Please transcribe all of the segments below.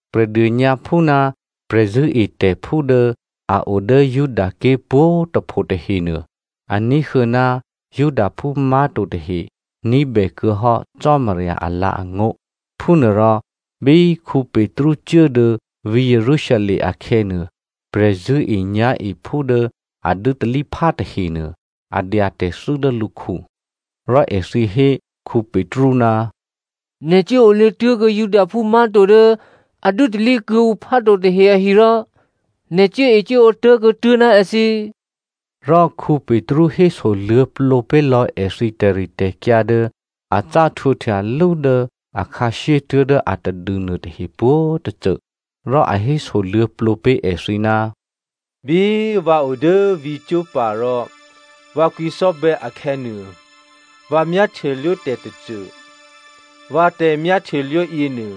Prè̤dônyǎphú ná prè̤zṳ̂́etè̤phú dố a o dố Judaké̤ pwǒ̤꤮ tôpho tahenuô, a ní̤huô̌ ná Judaphú má̤to tahe ní̤bè kuô̌hò́ Cò́marya alǎ̤angó̤. Phúnuôrò bí Petru cuố dố vǐ̤ Jerusalem akhè̌nuô, prè̤zṳ̂́enyá̤ephú dố a dû́talíphá tahenuô, a dya tè̤thû́ dố lǔkhu. Rò èthǐ hé Petru, “Nè̤ cuốolě tuố̤kuô̌ Judaphú má̤to dố a dû́talí kuô̌ǔ phá to tahe ahi rò nè̤ cuốecuốǒ tố̤kuô̌ tuố̤ ná èthǐ.” Rò Petru hésoluô̌plǒ pé̤lò̌ èthǐ tè̤ritè̤kyǎ dố a cá htwǒhtya lú dố akhǎshyé tuố̤dố atadû nuôtahe pwǒ̤tôcô. Rò a hésoluô̌plǒ pé̤ èthǐ, “Bí vǎ o dố vǐ̤ Joppa rò vǎ kwǐcò́bè̌ akhè̌nuô, vǎ myáhtyelwó tè̤tôcô. Vǎ tè̤myáhtyelwó yěnuô,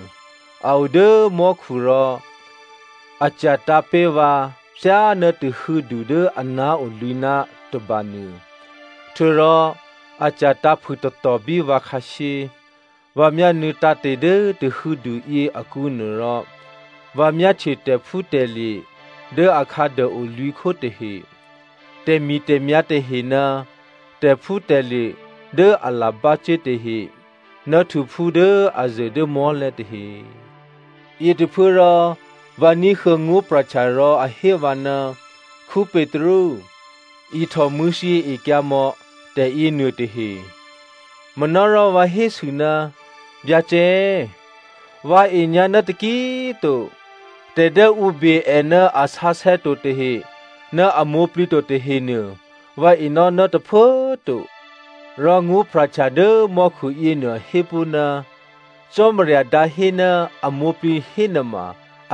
a o dố mò́khu rò a cya̤tǎ̤ pé̤ vǎ thyáná tahû̌du dố aná̤ o lwǐ̤ná̤ tôbanuô. Htuô̌rò a cya̤tǎ̤ phûtatò bí vǎ khǎshyé. Vǎ myánuô̌ tǎ̤te̤ dố tahû̌du yěakǔnuô rò vǎ myáhtye tè̤phútè̤lye̤ dố akhǎduô o lwǐ̤khó tahe, tè̤mi̤tè̤myá̤ tahe ná tè̤phútè̤lye̤ dố alabácuố tahe ná htuphú dố a zuô̤ dố mò́lè̤̌ tahe. Yětôphuốrò vǎ ní̤huô̌ ngó̤pra̤htya rò a hé vǎ, ‘Petru, ihtò mṳ̂̌thyěekyǎ mò̌ tè̤yěnuôtahe.’ “Manárò vǎ hésû, ‘Byacè꤮ vǎ e꤮ nyǎ ná taki꤮ to. Tè̤ dố ǔ be è ná a sǎsè̌ to tahe ná a mwǒ̤plǐ to tahenuô, vǎ enò́ ná tôphuố꤮ to.’ “Rò ngó̤pra̤htya dố mò́khu yěnuô hé pó̤, ‘Cò́marya dǎhé ná a mwǒ̤plǐ hénuôma,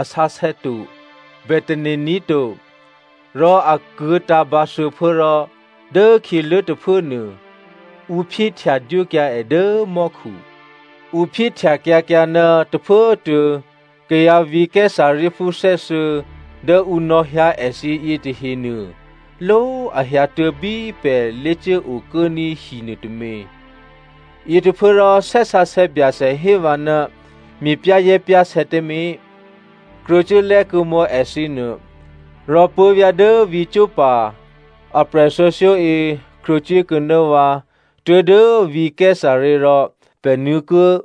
a sǎsè̌ to, bè tane̤ ní̤ to.’ Rò a kuô̌tǎ̤ bǎ thuô̌phuố rò dốkhyělố tôphuốnuô, ǔ phyéhtya dwókyǎ è dố mò́khu. “Ǔ phyéhtyakyǎkyǎ ná tôphuốtuô̌ kayǎ vǐ̤ Caesareaphú thè́thuô̌ dố ǔ nò̌hyǎ èthǐ yětahenuô, ló꤮, a hyǎtuố̤ bí pè̤ lé̤cuốokuốní̤ hi nuôtômě. Yětôphuốrò Thè́ Sǎsè̌ Byacè hé vǎ ná me̤pyá̤zè̤́pyá̤sè̌ tǎmé̤, krwǒcuố lè́kuô̌mò̌ èthǐnuô. Rò puố̤vyá̤ dố vǐ̤ Joppa aprè̤thuô̌thyó yě krwǒcuốkuô̌ ná vǎ tuố̤dố vǐ̤ Caesarea rò pè̤ nuô̌kuô̌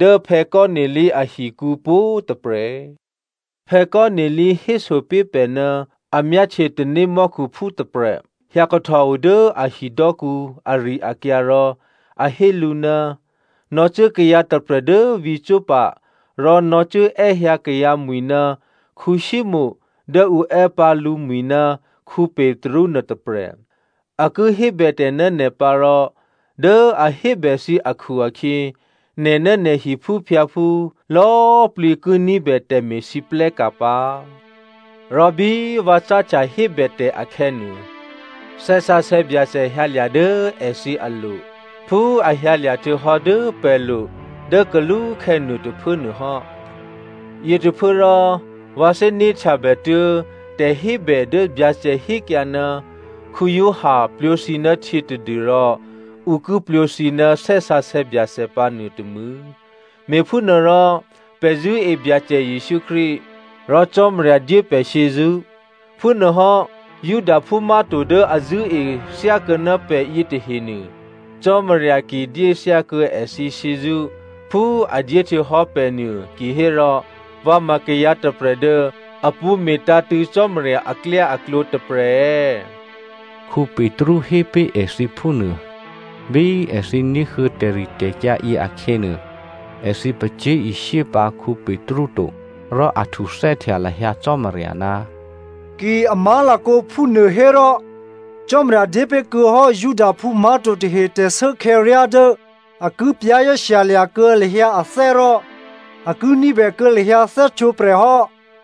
dố Cornelio ahikǔ pwǒ̤꤮ tôprè̤. Cornelio héso pé̤ pè̤ ná a myáhtye tanémò́khuphú tôprè̤ hyǎkahtòo dố a hidò́kǔ ari-akyǎ rò a hé lǔ, ‘Nò̌cuố kayǎ tôprè̤ dố vǐ̤ Joppa rò nò̌cuốè́hyǎ kayǎmwi̤ ná Simonè dố ǔ è́ pǎ lǔmwi̤ ná Petru nuôtôprè̤. A ki hébètè̤ ná nè̤ pǎ rò dố a hébè thǐ akhu-akhyě nè̤ ná nè̤ hiphúphyǎphú lò̌꤮ plǐ ki ní̤bè tè̤me̤lwóhteka̤ pǎ.’ “Rò bí vǎ cáhtya hébètè̤ akhè̌nuô, Thè́ Sǎsè̌ Byacè hyǎlya̤ dố èthǐ alo̤ phú a hyǎlya̤ htuô̌hò́ dố pè̤lo̤ dố kalúkhè̌ nuôtôphuố nuôhò́. Yětôphuốrò vǎ thè́né̤htyabè tuố̤ tè̤hébè dố Byacè hékyǎ, ‘Giovanni plwǒ thǐ ná htyě tadû́rò ǔ ki plwǒ thǐ ná Thè́ Sǎsè̌ Byacè pǎ nuôtômû̌.’ Me̤phúnuôrò pè̤ zṳ̂́e Byacè Jesǔ Krístu rò Cò́marya dyé pè̤ shyězṳ́, phúnuôhò́ Judaphú má̤to dố a zṳ̂́e thyákuô̌ná pè̤ yětahenuô, Cò́marya ki dyé thyákuô̌ èthǐ shyězṳ́ phú a dyé htuô̌hò́ pè̤nuô kihérò vǎ ma kayǎ tôprè̤ dố a pṳ̌ me̤tǎ̤tṳ̂̌ Cò́marya aklyáaklǒ tôprè̤ è̌?”, Petru hé pé̤ èthǐ phúnuô. Bí èthǐ ní̤huô̌ tè̤ritè̤kyǎ yě akhè̌nuô, èthǐ pacyé̤ishyé pǎ Petru to, rò a htuthè́htya lahyǎ Cò́marya, “Ki a má̤lakǒ phúnuôhérò Cò́marya dyépé̤kuô̌hò́ Judaphú má̤to tahe tè̤shuốkhè̌ryá dố a ki za̤ ní̤dûkuô̌ lahyǎ ané̤ rò a ki ní̤bè kuô̌ lahyǎ thè́htwǒprè̤ hò́.”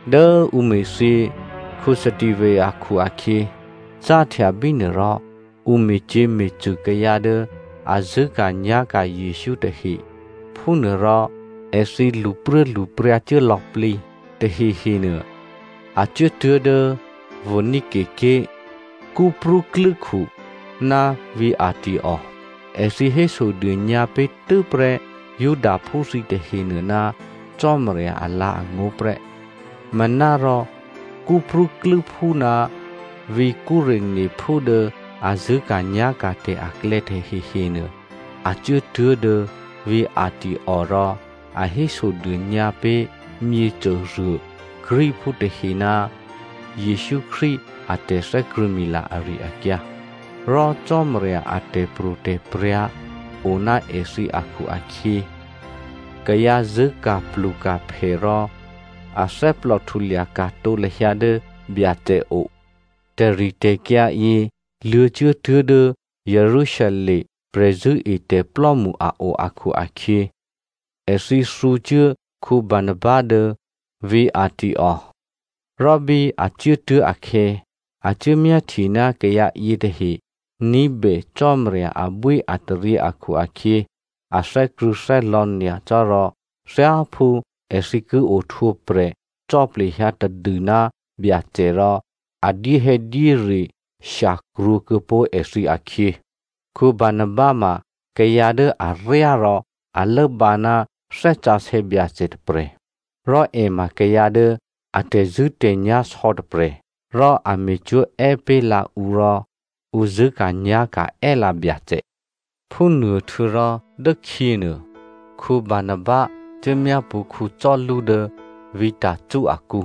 Dố ǔ me̤thyě Stephano akhu-akhyě, cáhtya bínuôrò ǔ me̤cyě̤me̤cṳ̂ kayǎ dố a zṳ̂́ka̤nyá̤ka̤ Jesǔ tahe phúnuôrò èthǐ lṳpruốlṳpryǎ cuố lò̌plǐ. Tahehenuô a cuốtuố̤ dố Phonicia ké̤, Cyprú klû́khu ná vǐ̤ Antioko. Èthǐ hésodônyǎ pé̤ tû́prè́ Judaphú thǐ tahenuô ná Cò́marya alǎ̤angó̤ prè́. Manárò Cyprúklû́phú ná vǐ̤ Cyreneophú dố a zṳ̂́ka̤nyá̤ka̤tè̤ aklè̌ tahehenuô, a cuốtuố̤ dố vǐ̤ Antioko rò a hésodônyǎ pé̤ myěcôruô Greekphú tahe ná Jesǔ Krístu a tè̤thè́krṳ̂̌mila ari-akyǎ. Rò Cò́marya a tè̤pro̤tè̤prya̤ o ná èthǐ akhu-akhyě kayǎ zṳ̂́ka̤pluka̤phè rò athè́plò htulya ka̤tǒ lahyǎ dố Byacè o. Tè̤ritè̤kyǎ yě luô̌cuốtuố̤ dố Jerusalem prè̤zṳ̂́etè̤plò́mṳ a o akhu-akhyě èthǐ thǔcuố Barnaba dố vǐ̤ Antioko. Rò bí a cuốtuố̤ akhè̌, a cuốmyáhtye ná kayǎ yětahe ní̤bè Cò́marya abwíataryě akhu-akhyě a thè́krṳ̂̌thè́lò̌ nyacò́ rò thyáphú èthǐ ki ohtwǒprè̤ cò́ plehyǎ tadû ná Byacè rò, a dyéhè̌dyére shyakrwǒ kuô̌pó̤ èthǐ akhyě. Barnaba ma kayǎ dố aryá rò a lốbǎ ná Thè́ Sǎsè̌ Byacè tôprè̤. Rò è ma kayǎ dố a tè̤zṳ̂́tè̤nyá̤ sò̌ tôprè̤. Rò a me̤cwó̤ è́ pé̤lǎ ǔ rò ǔ zṳ̂́ka̤nyá̤ka̤ è́lǎ Byacè. Phúnuôhtuô̌rò dốkhyěnuô, Barnaba cuốmyápṳ̌ Saulu dố vǐ̤ Tarso akǔ.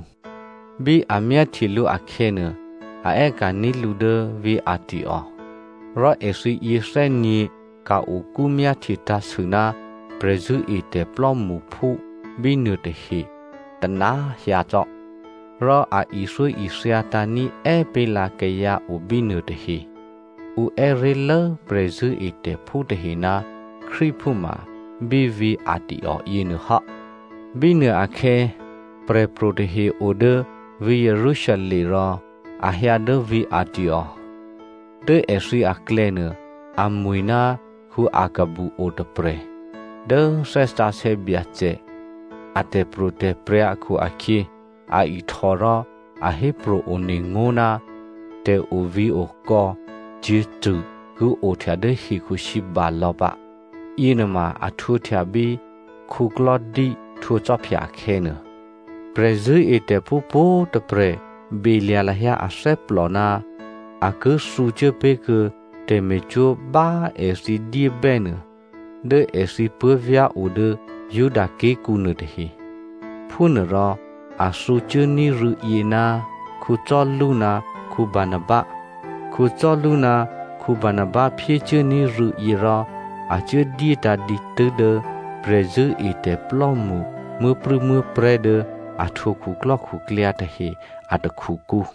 Bí a myáhtye lǔ akhè̌nuô, a è́ka̤ní̤ lǔ dố vǐ̤ Antioko. Rò èthǐ yěthè́nyě̤ ka̤-okú myáhtye tǎ̤sû ná prè̤zṳ̂́etè̤ plò́mṳphú bínuô tahe tôna꤮ hyǎ cò́. Rò a ithyóithyatǎ̤ ní̤è́ pé̤lǎ kayǎ obínuô tahe. Ǔ è́ré̤lố prè̤zṳ̂́etè̤phú tahe ná Krístuphú ma bí vǐ̤ Antioko yěnuô hò́. Bínuôakhè̌, prè̤pro̤ tahe o dố vǐ̤ Jerusalem rò a hyǎ dố vǐ̤ Antioko. Dố èthǐ aklè̌nuô amwi̤ ná Aghabu otôprè̤. Dố Thè́ Sǎsè̌ Byacè a tè̤pro̤tè̤prya̤ akhu-akhyě, a ihtò rò a hépro̤ one ngó̤ ná tè̤ovǐ̤okò̌ cyě̤cṳ̂ ki ohtya dố hekhusǐba lò̌ pǎ. (Yěnuôma a htwǒhtya bí Claudio htwǒ khwí akhè̌nuô.) Prè̤zṳ̂́etè̤phú pwǒ̤꤮ tôprè̤ belya̤ lahyǎ athè́plò ná a ki thǔcuố pé̤ kuô̌ tè̤me̤cwó̤ bá èthǐ dyébè́ nuô, dố èthǐ puố̤vyá̤ o dố Judaké̤kǔ nuôtahe. Phúnuôrò a thǔcuốní̤ rû̌yě ná Saulu ná Barnaba. Saulu ná Barnaba phyécuốní̤ rû̌yě rò a cuố dyétǎ̤ dǐtû́ dố prè̤zṳ̂́etè̤plò́mṳ muố̤prû̌muố̤prè̤́ dố a htwǒ khuklò́khuklyǎ tahe a takhukǔ.